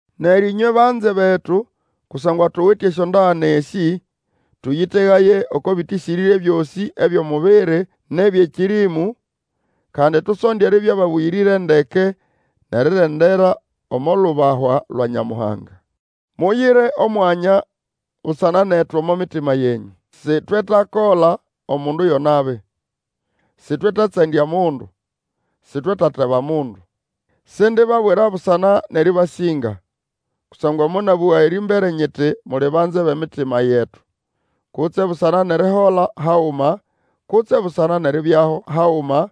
Neryo ĩnywe banze betu, kusangwa tuwite esyondagane esĩ, tũyĩtegaye oko bĩtĩsĩrĩre byosĩ ebyʼomubiri nʼebyʼekĩrĩmũ, kandi tusonde eribya ababũyĩrĩre ndeke, nʼerirendera omo lubahwa lwa Nyamuhanga. Muyire omwanya busana netu omo mitima yenyũ; sitwetakola omundu yo nabi, sitwetatsandya mundu, sitwetateba mundu. Sindibabwira busana nʼerĩbasĩnga, kusangwa monabũga erĩmbere nyiti muli banze bʼemitima yetu, kutse busana nʼerihola haguma, kutse busana nʼeribyaho haguma.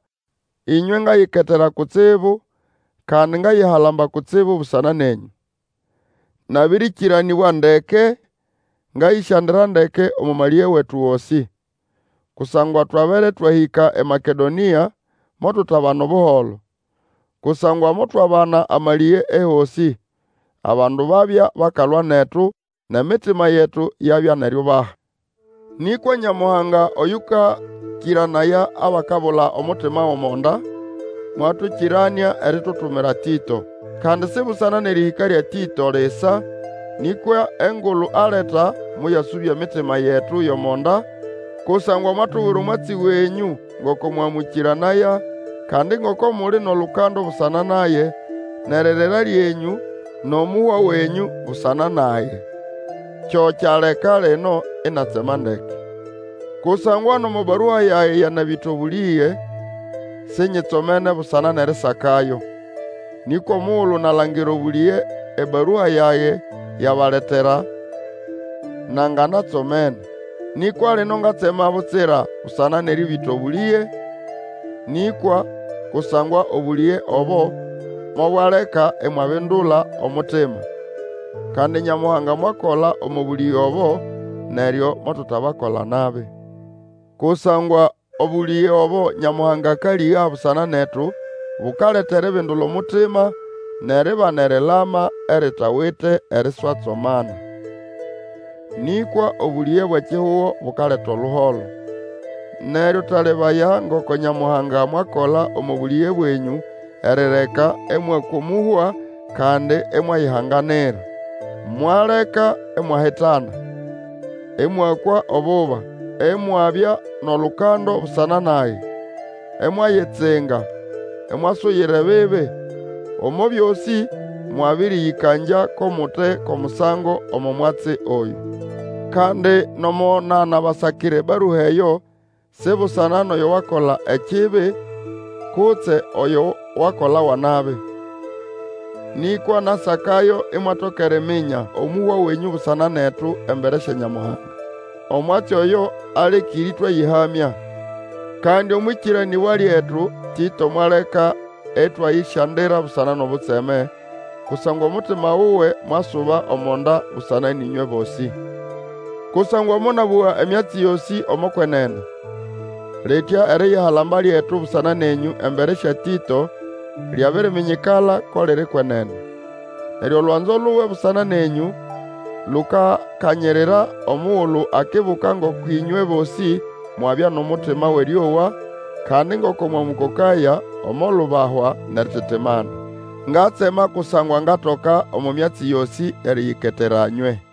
Ĩnywe ngayiketera kutsibu, kandi ngayihalamba kutsibu busana nenyũ; nabĩrĩkĩranĩbwa ndeke, ngayĩsyandira ndeke omo malĩge wetu gosĩ. Kusangwa twabere twahĩka eMakedonĩa motutabana Obuholo. Kusangwa motwabana amalĩge ehosĩ; abandu babya bakalwa netu, nʼemitima yetu yabya nʼeriubaha. Nĩkwa Nyamuhanga oyũkakĩranaya abakabula omutima gʼomo nda, mwatũkĩranĩa eritutumira Tĩto. Kandi si busana nʼerĩhĩka lya Tĩto lisa, nĩkwa engulu aleta moyasũbya emitima yetu yʼomo nda, kusangwa mwatubwira omwatsi wenyũ ngoko mwamũkĩranaya, kandi ngoko muli nʼolukando busana nage, nʼeririra lyenyũ, nʼomuhwa wenyũ busana nage. Kyo kyaleka lino inatsema ndeke. Kusangwa nomo barua yage yanabĩta obũlĩge, sinyitsomene busana nʼerisakayo, nĩkwa omugulu nalangira obũlĩge ebarua yage yabaletera, nanganatsomene. Nĩkwa lino ngatsema butsira busana nʼerĩbĩta obũlĩge nĩkwa kusangwa obũlĩge obo mobwaleka imwabindula omutima. Kandi Nyamuhanga mwakola omo bũlĩge obo, neryo motutabakola nabi. Kusangwa obũlĩge obo Nyamuhanga akalĩga busana netu bukaleta eribindula omutima, nʼeribana erilama eritawite eriswatsomana. Nĩkwa obũlĩge bwʼekihugo bukaleta oluholo. Neryo talebaya ngoko Nyamuhanga mwakola omo bũlĩge bwenyũ erireka ĩmwakwa omũhwa, kandi imwayihanganira. Mwaleka imwahitana, ĩmwakwa obuba, imwabya nʼolukando busana nage, imwayitsinga, imwasuyira ebibi! Omo byosĩ mwabĩrĩyĩkangya ko mute ko musango omo mwatsi oyũ. Kandi nomo nanabasakira ebarua eyo si busana nʼoyo wakola ekibi, kutse oyo wakolawa nabi. Nĩkwa nasakayo imwatoka eriminya omũhwa wenyũ busana netu embere sya Nyamuhanga. Omwatsi oyo alekĩre ĩtwayĩhamya. Kandi omwʼĩkĩranĩbwa lyetu Tĩto mwaleka ĩtwayĩsyandira busana nʼobutseme, kusangwa omutima wuwe mwasuba omo nda busana nʼĩmywe bosĩ. Kusangwa monabũga emyatsi yosĩ omo kwenene, litya eriyihalamba lyetu busana nenyũ embere sya Tĩto, lyabiriminyikala ko liri kwenene. Neryo olwanzo luwe busana nenyũ lukakanyirira, omugulu akibuka ngoko ĩnywe bosĩ mwabya nʼomutima wʼerĩowa, kandi ngoko mwamũkokaya omo lubahwa nʼerititimana. Ngatsema kusangwa ngatoka omo myatsi yosĩ eriyiketera nywe.